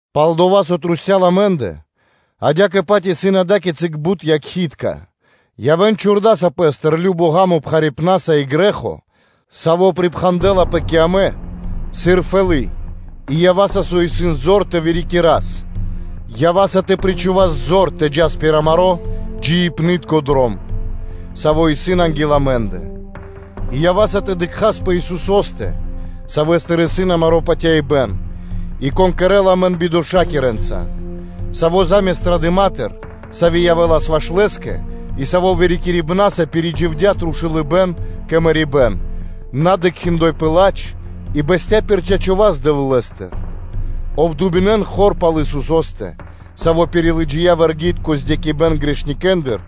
Пал-дова́ со трусця́л амэ́ндэ адя́кэ-паць исын ада́кицы бут якхи́тка/якхалэ́ (свидетели), явэ́н чхурдаса пэ́стыр любо ґа́мо пхарипнаса и грэ́хо, саво́ припхандэлапэ кэ амэ сыр фэлы́ (сетка) и ява́са со исын зор тэ вырикирас, ява́са тэ причхувас зор тэ джас пир амаро́ джиибнытко дром, саво́ исын анги́л амэ́ндэ; и ява́са тэ дыкхас пэ Исусо́стэ, Савэ́стыр исын амаро́ патяибэ́н, и Саво́ кэрэ́ла амэн бидошакирэнца, Саво́ заме́ст ра́дыма, сави́ явэ́лас ваш Лэ́скэ, и Саво́ вырикирибнаса пиридживдя трушулыбэн кэ мэрибэ́н, на дыкхи́ пэ ладж, и бэсця́ пир чачо́ (право) васт Дэвлэ́стыр. Обдуминэн хор пал Исусо́стэ, Саво́ пирилыджия вэргитко бипатывакиро сабэн грэхитконэндыр,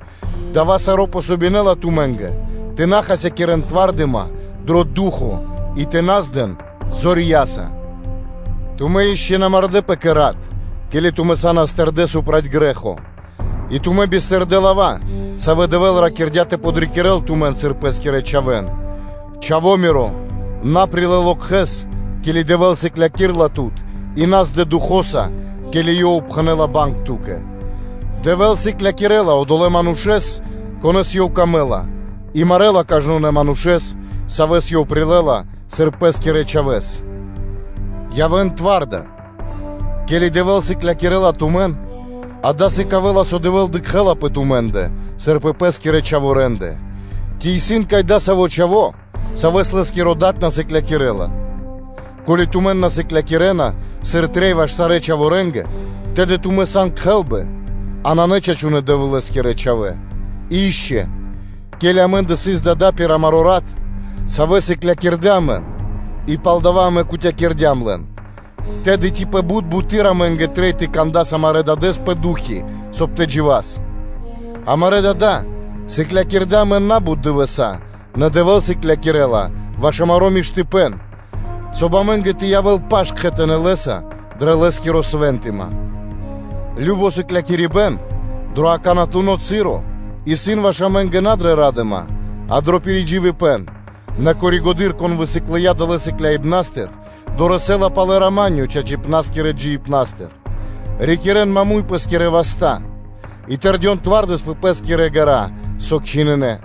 дава́ саро́ дэ́ла васт тумэ́нгэ тэ на хасякирэ́н зор дро ду́хо (фа́но) и тэ на здэн зорья́са. Тумэ́ ишчо (инкэ́) на мардэ́пэ кэ рат, ке́ли тумэ́ са́нас тэрдэ́ проти грэ́хо. И тумэ́ бистырдэ лава́, савэ́ Дэвэ́л ракирдя́ тэ подрикирэ́л тумэн, сыр Пэ́скирэ чхавэ́н: “Чхавоа миро, на лэ пэ ило локхэс, ке́ли Дэвэ́л сыклякирэ́ла тут, и на здэпэ духо́са, ке́ли Ёв пхэнэ́ла зорья́са банг ту́кэ; Дэвэ́л сыклякирэ́ла одолэ́ манушэ́с, конэ́с Ёв выкэдэ́ла, и марэла кажнонэ́ манушэ́с, савэ́с Ёв прилэ́ла, сыр Пэ́скирэ чхавэ́с.” Явэ́н вырикирдэ, ке́ли Дэвэ́л сыклякирэ́ла тумэн, дава́ сыкавэ́ла, со Дэвэ́л дыкхэ́ла пэ тумэ́ндэ, сыр пэ Пэ́скирэ чхаворэндэ. Ци исын вари-кай адасаво́ чхаво́, савэ́с лэ́скиро дад на сыклякирэ́ла? Ко́ли тумэн на сыклякирэ́на, сыр трэй ваш сарэ́ чхаворэнгэ, тэды тумэ́ сан кхэлбы, а на чачунэ́ Дэвлэ́скирэ чхавэ́. И ишчо (инкэ́): ке́ли амэ́ндэ сыс дада́ пир амаро́ рат, савэ́ сыклякирдэ́ амэн, и палдава́ амэ кутякирдям лэн, тэды ци пэ бут буты́р амэ́нгэ трэй тэ кандас амарэ́ Дадэ́с пэ ду́хо (фа́но), соб (кай) тэ джива́с? Амарэ́ дада́ сыклякирдэ́ амэн на́бут дывэса́, нэ Дэвэ́л сыклякирэ́ла ваш амаро́ миштыпэ́н, соб (кай) амэ́нгэ тэ явэ́л паш кхэтанэ́ Лэ́са дрэ Лэ́скири свэнтыма. Кажно сыклякирибэ́н дро акаканатуно часо исын ваш амэ́нгэ на дрэ ра́дыма, а дро пиридживибэн, нэ пало́ (после) дова́, кон высыклыя далэ́ сыклякирибна́стыр, дорэсэ́ла палэ рама́нё (миро) чачипна́скирэ джиибнастыр. Рикирэ́н маму́й (прямэс) пэ́скирэ васта́ и тэрдён сыр трэй пэ пэ́скирэ ґэра́, савэ́ кхинынэ.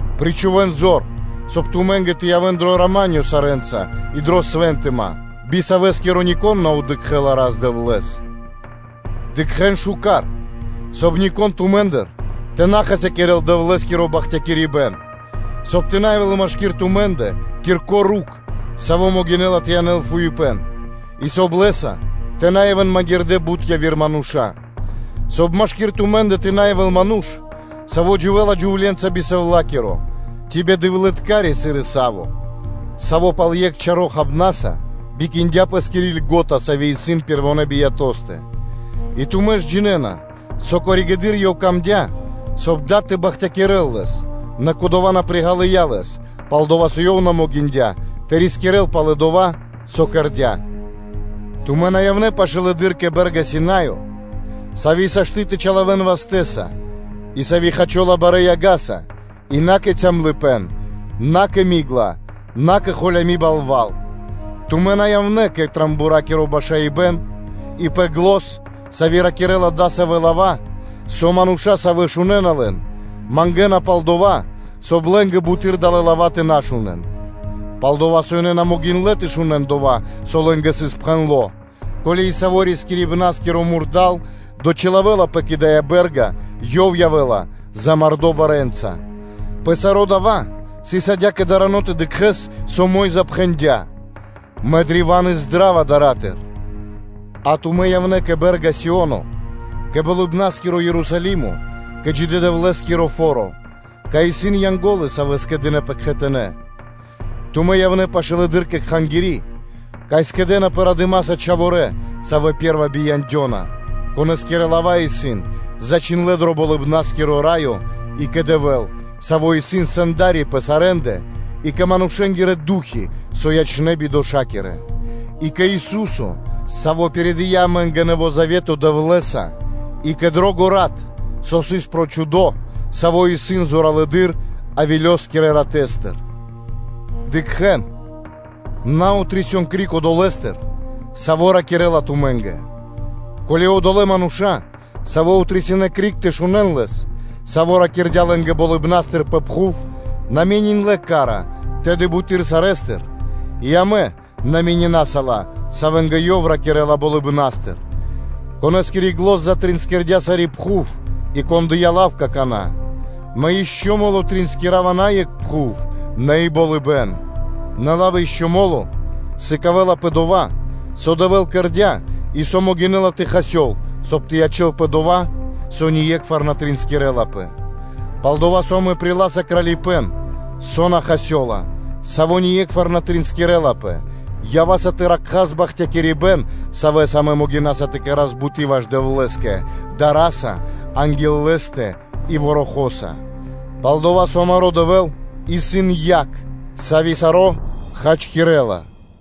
Причхувэ́н зор, соб (кай) тумэ́нгэ тэ явэ́н дро рама́нё (миро) сарэ́нца и дрэ свэнтыма, би савэскиро нико́н на дыкхэ́ла Рас-Дэвлэ́с. Дыкхэ́н миштэ́с, соб (кай) нико́н тумэ́ндыр тэ на хасякирэ́л Дэвлэ́скиро бахтякирибэ́н, соб (кай) тэ на явэ́л машки́р тумэ́ндэ кирко́ рукх (корнё), саво́ могинэ́ла тэ янэл фуипэ́н, и соб (кай) лэ́са тэ на явэ́н магирдэ́ бут яви́р мануша́; соб (кай) машки́р тумэ́ндэ тэ на явэ́л ману́ш, саво́ дживэ́ла джувле́нца би сэвлакиро, ци бидэвлыткари, сыр Иса́во, саво́ пал екх чаро́ хабнаса бикиндя пэ́скири льго́та, сави́ исын пэрвонэ́ биятостэ. И тумэ́ ж джинэ́на, со пало́ (после) дова́ ёв мыслиндя, соб (кай) дад тэ бахтякирэ́л лэс, нэ кодова́ на приґалыя лэс, пал-дова́ со ёв на могиндя́ тэ рискирэ́л палэ дова́, со кэрдя́. Тумэ́ на явнэ́ пашылэды́р кэ бэ́рга Синаё, сави́ сашты́ (можна) тэ чилавэн вастэ́са, и сави́ хачола барэ́ яга́са, и на кэ калыпэ́н (тьма), на кэ ми́гла (мрако), на кэ холями балва́л, тумэ́ на явнэ́ пэ рого́скиро (трубакиро) башаибэн, и пэ зан, сави́ ракирэ́ла дасавэ́ лава́, со мануша́, савэ́ шунэ́на лэн, мангэна пал дова́, соб (кай) лэ́нгэ буты́р далэ́ лава́ тэ на шунэ́н; пал-дова́ со ёнэ на могиндлэ́ тэ шунэ́н дова́, со лэ́нгэ сыс пхэндло́: “Ко́ли и саво́ рискирибна́скиро мурда́л (зверё) дочилавэлапэ кэ дая́ бэ́рга, ёв явэ́ла замардо (мулякирдо) барэ́нца”; пэ саро́ дава́ сыс адя́кэ дарано тэ дыкхэ́с, со Мо́йза пхэндя́: “Мэ древа́н издрава дара́тыр; а тумэ́ явнэ́ кэ бэ́рга Сио́но, кэ Болыбна́скиро Ерусалимо, кэ джидэ́-Дэвлэ́скиро фо́ро, кай исын Янго́лы, Савэ скэдынэ́пэ кхэтанэ́, тумэ́ явнэ́ пашылэды́р кэ Кхангири́, кай скэдынэ́пэ радыма́са чхаворэ́, савэ́ пэ́рва бияндёна, конэскирэ лава́ исын зачхиндлэ́ дро Болыбна́скиро Раё, и кэ Дэвэ́л, Саво́ исын Сэнда́ри пэ сарэ́ндэ и кэ манушэ́нгирэ ду́хи, со ячнэ́ бидошакирэнца; и кэ Ису́со, Саво́ пиридыя амэ́нгэ Нэво́ Завето Дэвлэ́са и кэ дро́го рат, со сыс прочхудо, саво́ исын зоралэды́р Авелёскирэ ратэстыр. Дыкхэ́н, на отрисён криг Одолэ́стыр, Саво́ ракирэ́ла тумэ́нгэ. Ко́ли одолэ́ мануша́, савэ́ отрисинэ криг тэ шунэ́н Лэс, Саво́ ракирдя́ лэ́нгэ Болыбна́стыр пэ пхув, на мениндлэ ка́ра, тэды буты́р сарэ́стыр и амэ на менинаса ла, савэ́нгэ Ёв ракирэ́ла Болыбна́стыр: Конэ́скири зан затринскирдя́ сари́ пхув, и Кон дыя́ лав какана́: “Мэ ишчо (инкэ́) мо́ло триинскирава на екх пхув, нэ и болыбэ́н. Нэ лав “ишчо (инкэ́) мо́ло” сыкавэ́ла пэ дова́, со Дэвэ́л кэрдя́, и со могинэ́ла тэ хасёл, соб (кай) тэ ячэ́лпэ дова́, со ние́кхвар на тринскирлапэ. Пал-дова́ со амэ приласа кралипэ́н, саво́ ние́кхвар на триинскирэлапэ, ява́са тэ ракхас бахталыпэ́н, савэ́са амэ могинаса тэ кэра́с буты́ ваш Дэвлэ́скэ дара́са анги́л Лэ́стэ и ворохо́са (барэ́ дара́са). Пал-дова́ со амаро́ Дэвэ́л исын яг, сави́ саро́ хачкирэ́ла.